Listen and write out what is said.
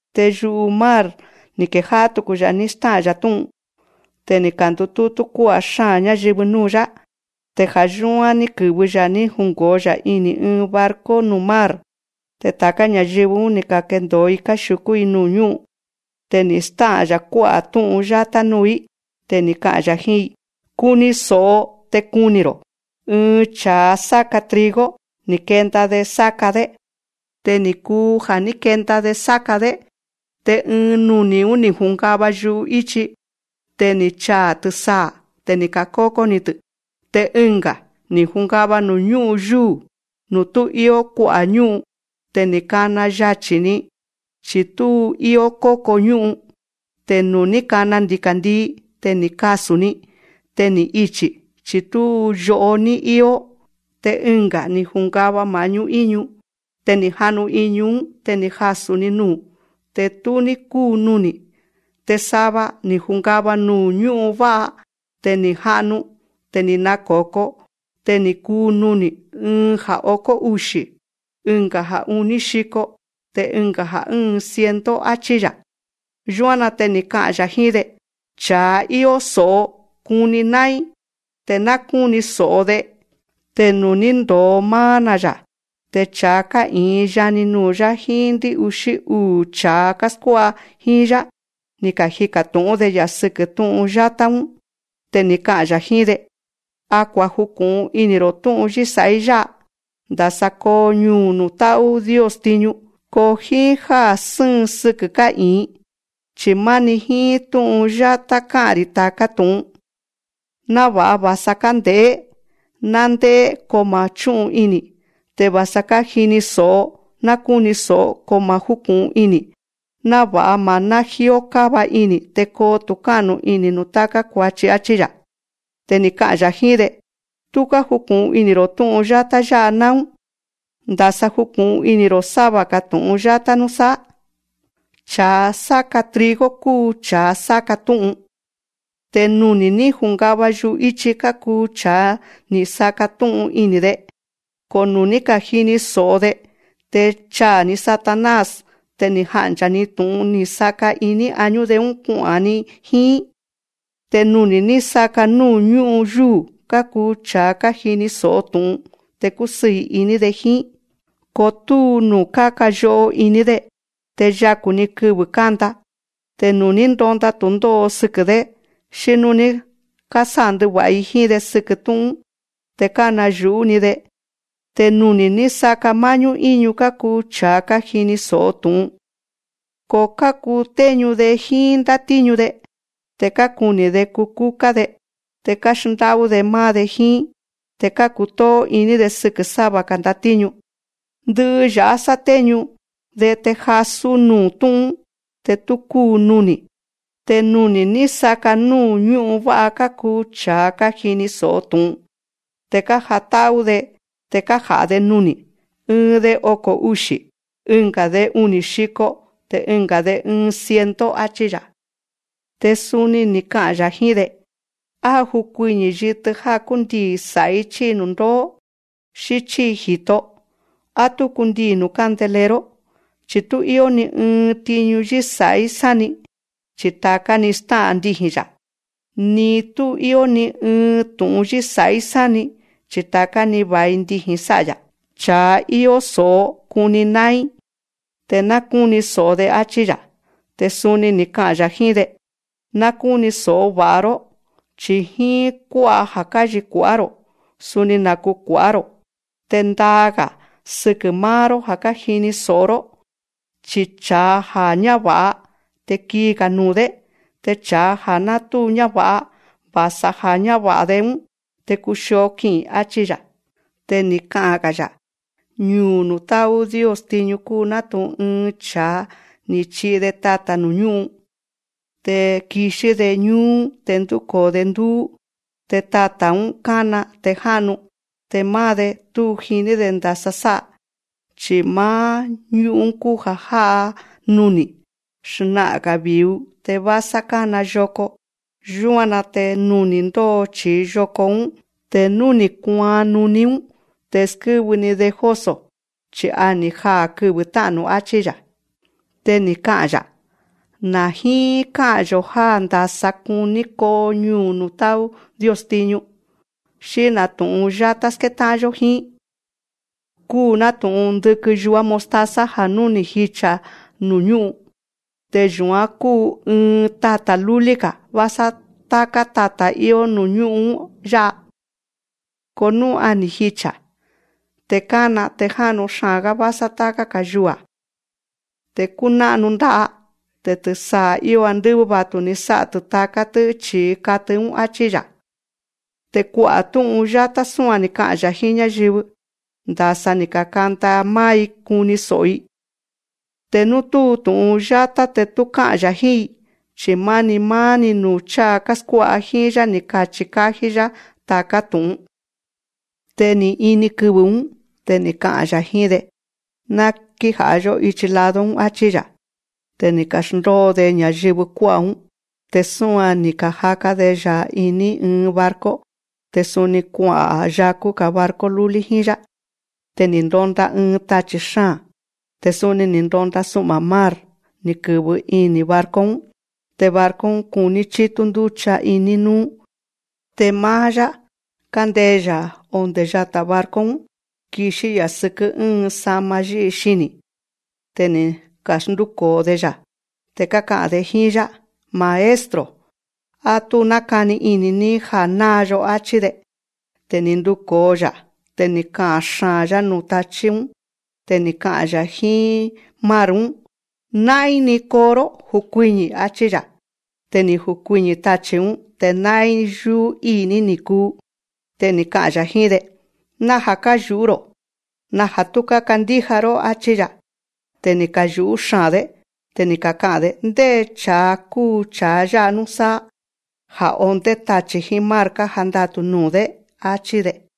Te yu'u mar ni̱ kejá'á tuku‑ya̱ ní stá'a̱n‑ya̱ tú'un. Te ni̱ ka̱ndutútú kuá'a̱ xáa̱n ñáyɨvɨ núu̱‑yá. Te ja̱ yúán ní kɨ̱vɨ‑ya̱ ní jungo̱o‑ya̱ iní ɨɨn barco nuu̱ mar. Te ta̱ká ña̱yɨvɨ‑ún, ni̱ ka̱kendo̱o‑i káxiu̱kú‑i nuu̱ ñú'un. Te ni̱ stá'a̱n‑ya̱ kuá'a̱ tú'un yátá núu̱‑í. Te ni̱ ka'a̱n‑ya̱ jíín‑i: Kuni so̱'o te kuni̱‑ro̱: Ɨɨn cha̱a sáka trigo, ni̱ kenda‑de sáka‑dé. Te ni̱ kuu ja̱ ní kenda‑de sáka‑dé, te ɨɨn nuni̱‑ún, ni̱ jungava yu'íchi. Te ni̱ chaa̱ tɨsaa̱. Te ni̱ ka̱kókó‑tɨ́. Te ɨnga̱, ni̱ jungava nuu̱ ñú'un yúu̱, nuu̱ tú íó kua'a̱ ñú'un. Te ni̱ kana yachi̱‑ni, chi̱ tú íó kókon ñu'un. Te nuu̱ ní kana ndika̱ndii, te ni̱ kasu̱n‑ni. Te ni̱ ichi̱, chi̱ tú yo'o ní íó. Te ɨnga̱, ni̱ jungava ma̱'ñú ínu. Te ni̱ ja'nu iñu‑ún. Te ni̱ jasu̱ nuu̱. Te tú ní kúun nuni̱. Te sava, ni̱ ka̱jungava nuu̱ ñú'un vá'a. Te ni̱ ka̱ja'nu. Te ni̱ nako̱ko. Te ni̱ kuun nuni̱. Ɨɨn ja̱ okó uxi̱, ɨnga̱ ja̱ uní xiko, te ɨnga̱ ja̱ ɨ́ɨn ciento, áchí‑ya̱. Yúan‑na te ni̱ ka'a̱n‑ya̱ jíín‑de: Cha̱a íó so̱'o kuni ná'ín, te ná kúni so̱'o‑de. Te nuu̱ ní ndo̱o máá‑na̱‑ya̱, te cha̱a ká'i̱in yani nuu̱‑yá jíín ndɨ́'uxí uu̱ cha̱a káskuá'a jíín‑yá, ni̱ kajika̱ tu̱'ún‑de‑ya̱ sɨkɨ́ tú'un yátá‑ún. Te ni̱ ka'a̱n‑ya̱ jíín‑de: A kuaju̱ku̱'un ini̱‑ro̱ tú'un yísa̱'í yá'a, ndasa koo ñuu̱ nuu̱ tá'ú Dios tiñu. Ko jíín já sɨ́ɨn sɨkɨ̱ ká'i̱in, chi̱ máni jíín tú'un yátá ká'a̱n‑ri̱ ta̱ká tu̱'un. Náva̱'a va̱sa kánde̱'é, ná ndé'é ko ma̱ chú'un ini̱. Te va̱sa kájini so̱'o, ná kúni so̱'o ko ma̱ júku̱'un ini̱. Náva̱'a ma̱ ná jíó káva ini̱, te koo tu̱ká'nu ini̱ nuu̱ táká kua̱chi, áchí‑ya̱. Te ni̱ ka'a̱n‑ya̱ jíín‑de: Tú kájuku̱'un ini̱‑ro̱ tú'un yátá yá'a náún. Ndasa juku̱'un ini̱‑ro̱ sáva‑ga̱ tu̱'un yátá núsáá. Cha̱a sáka trigo kúu cha̱a sáka tú'un. Te nuni̱ ní ka̱jungava yu'íchi kákuu cha̱a ni̱ saka̱ tú'un ini̱‑de. Ko nú ni̱ ka̱jini so̱'o‑de, te cháa̱‑ni Satanás te jánchaa̱‑ni tu̱'un ni̱ saka̱ iní añú‑de‑ún kua'a̱n‑ni jíín. Te nuni̱ ní saka̱ núu̱ ñú'un yúu̱, kákuu cha̱a kájini so̱'o tu̱'un, te kúsɨɨ̱ iní‑de jíín. Ko túu nuu̱ káka yo'o iní‑de. Te yaku̱‑ni kɨvɨ̱ kánda. Te nú ni̱ ndonda tu̱ndó'o sɨkɨ̱‑dé, xí nú ni̱ sándɨva̱'a‑i jíín‑de sɨkɨ̱ tú'un‑ún, te kánayu̱'ú‑ni‑de. Te nuni̱ ní saka̱ má'ñú íñu kákuu cha̱a kájini so̱'o tu̱'un. Ko kákutéñu‑de jíín ndátíñu‑de. Te kákuni̱‑de kukúká‑de, te káxndá'ú‑de máá‑de jíín. Te kákutóó iní‑de sɨkɨ̱ sáva‑ga̱ ndatíñu. Ndɨ'ɨ ya̱'á sátéñu‑de te jasú nuu̱ tú'un‑ún, te tú kúun nuni̱. Te nuni̱ ní saka̱ núu̱ ñú'un vá'a kákuu cha̱a kájini so̱'o tu̱'un. Te kájatá'ú‑de te kája̱'a‑de nuni̱. Ɨɨn‑de oko̱ uxi̱, ɨnga̱‑de uni̱ xiko, te ɨnga̱‑de ɨɨn ciento, áchí‑ya̱. Te suni ni̱ ka'a̱n‑ya̱ jíín‑de: Á júkuiñi̱ yitɨ já kúndii̱ sa̱'í chi̱i nu̱ndóó, xí chíi ji̱to. Á tú kundii̱ nuu̱ candelero. Chi̱ tú íó ni ɨɨn tiñu yísa̱'í sáni, chi ta̱ká‑ni stá'a̱n ndiji̱n‑ya̱. Ni tú íó ni ɨɨn tu̱'un yísa̱'í sáni, chi ta̱ká‑ni va̱i ndiji̱n sá'a‑ya̱. Cha̱a íó so̱'o kuni ná'ín, te ná kúni so̱'o‑de, áchí‑ya̱. Te suni ni̱ ka'a̱n‑ya̱ jíín‑de: Ná kúni so̱'o va̱'a‑ró. Chi̱ jíín kú'a ja̱ káchikua̱'á‑ro̱, suni naku̱kua̱'á‑ro̱. Te ndaa‑ga̱ sɨkɨ̱ máá‑ró já kájini so̱'o‑ró. Chi cha̱a ja̱ á ñáva̱'a, te kii‑ga̱ nuu̱‑dé. Te cha̱a ja̱ ná tú ñáva̱'a, va̱sa ja̱ á ñáva̱'a‑de‑ún te kuxio ki'i̱n, áchí‑ya̱. Te ni̱ ka'a̱n‑ga̱‑ya̱: Ñuu̱ nuu̱ tá'ú Dios tiñu kúu nátu̱'un ɨɨn cha̱a ni̱ chi'i‑de tata̱ nuu̱ ñú'un. Te kixí‑de ñúú te ndúko̱o‑de ndúú. Te tata̱‑ún a kána te já'nu. Te máá‑de, tú jiní‑de ndasa sá'a. Chi̱ máá ñú'un kúu ja̱ já'a nuni̱. Xna'a̱n‑ga̱ vi̱u, te vásá kána yoko. Yúan‑na te nuni̱ ndóo chíi yoko‑ún. Te nú ni̱ kuaan nuní‑ún, te skɨ́vɨ‑ni‑de jóso̱, chi̱ a ni̱ jaa̱ kɨvɨ̱ tá'nu̱, áchí‑ya̱. Te ni̱ ka'a̱n‑ya̱: Na̱ jíín ká'a̱n‑yo̱ já ndása kuní koo ñuu̱ nuu̱ tá'ú Dios tiñu. Xí na̱ tu̱'un yátá skétá'an‑yó jíín. Kúu nátu̱'un ndɨkɨn yuá mostaza ja̱ nú ni̱ jicha̱ nuu̱ ñú'un, te yu̱án kúu ɨɨn tata̱ lúlí‑ga̱ vásá táká tata̱ íó nuu̱ ñú'un‑ún yá'a. Ko nú a ni̱ jicha̱. Te kana, te já'nu xaa̱n‑gá vásá táká‑ga̱ yua̱. Te kúná'nu nda'a. Te tɨsaa̱ íó andɨ́vɨ́ va̱tu‑ni sá'a‑tɨ́ taká‑tɨ̱ chíi katɨ‑ún, áchí‑ya̱. Te kua'a̱ tú'un yátá súan ni̱ ka'a̱n‑ya̱ jíín ñáyɨvɨ, ndasa ni̱ ka̱kanda máá‑i kuni so̱'o‑i. Te nú tú tu̱'un yátá te tú ká'a̱n‑ya̱ jíín‑i. Chi̱ máni máá‑ni nuu̱ cháa káskuá'a jíín‑yá ni̱ kachi̱ ka̱jí‑yá ta̱ká tu̱'un. Te ni̱ ini kɨvɨ̱‑ún. Te ni̱ ka'a̱n‑ya̱ jíín‑de: Ná kíja̱'a‑yó íchi lado‑ún, áchí‑ya̱. Te ni̱ ka̱xndóo‑de ña̱yɨvɨ kuá'a̱‑ún. Te súan‑ni ni̱ ka̱jaka‑de‑ya̱ iní ɨɨn barco. Te suni kua'a̱n yaku̱‑ga̱ barco lúlí jíín‑yá. Te ni̱ ndonda ɨɨn tachi̱ xáa̱n. Te suni ni̱ ndonda su'ma̱ mar, ni̱ kɨ̱vɨ ini̱ barco‑ún. Te barco‑ún kuní chítú ndúcha iní núú. Te máá‑yá, kándee‑ya̱ ondé yata̱ barco‑ún, kixí‑ya̱ sɨkɨ́ ɨ́ɨn sa'ma yí'i xini̱. Te ni̱ ka̱xndúko̱o‑de‑ya̱. Te káka'a̱n‑de jíín‑yá: Maestro, á tú nákani ini̱‑ní ja̱ náa‑yo, áchí‑de. Te ni̱ nduko̱o‑ya̱. Te ni̱ ka'a̱n xaa̱n‑yá nuu̱ tachí‑ún. Te ni̱ ka'a̱n‑ya̱ jíín mar‑ún: Ná'ín‑ni koo‑ró, jukuiñi̱, áchí‑ya̱. Te ni̱ jukuiñi̱ tachi̱‑ún, te ná'ín yúú íi̱‑ní ni̱ kuu. Te ni̱ ka'a̱n‑ya̱ jíín‑de: Naja̱ káyu̱'ú‑ro̱. Naja̱ tú kákandíja‑ró, áchí‑ya̱. Te ni̱ kayu̱'ú xaa̱n‑dé. Te ni̱ kaka'a̱n‑de: Ndé cha̱a kúu cha̱a yá'a núsáá, ja̱ ondé tachi̱ jíín mar kájandatu̱ nuu̱‑dé, áchí‑de.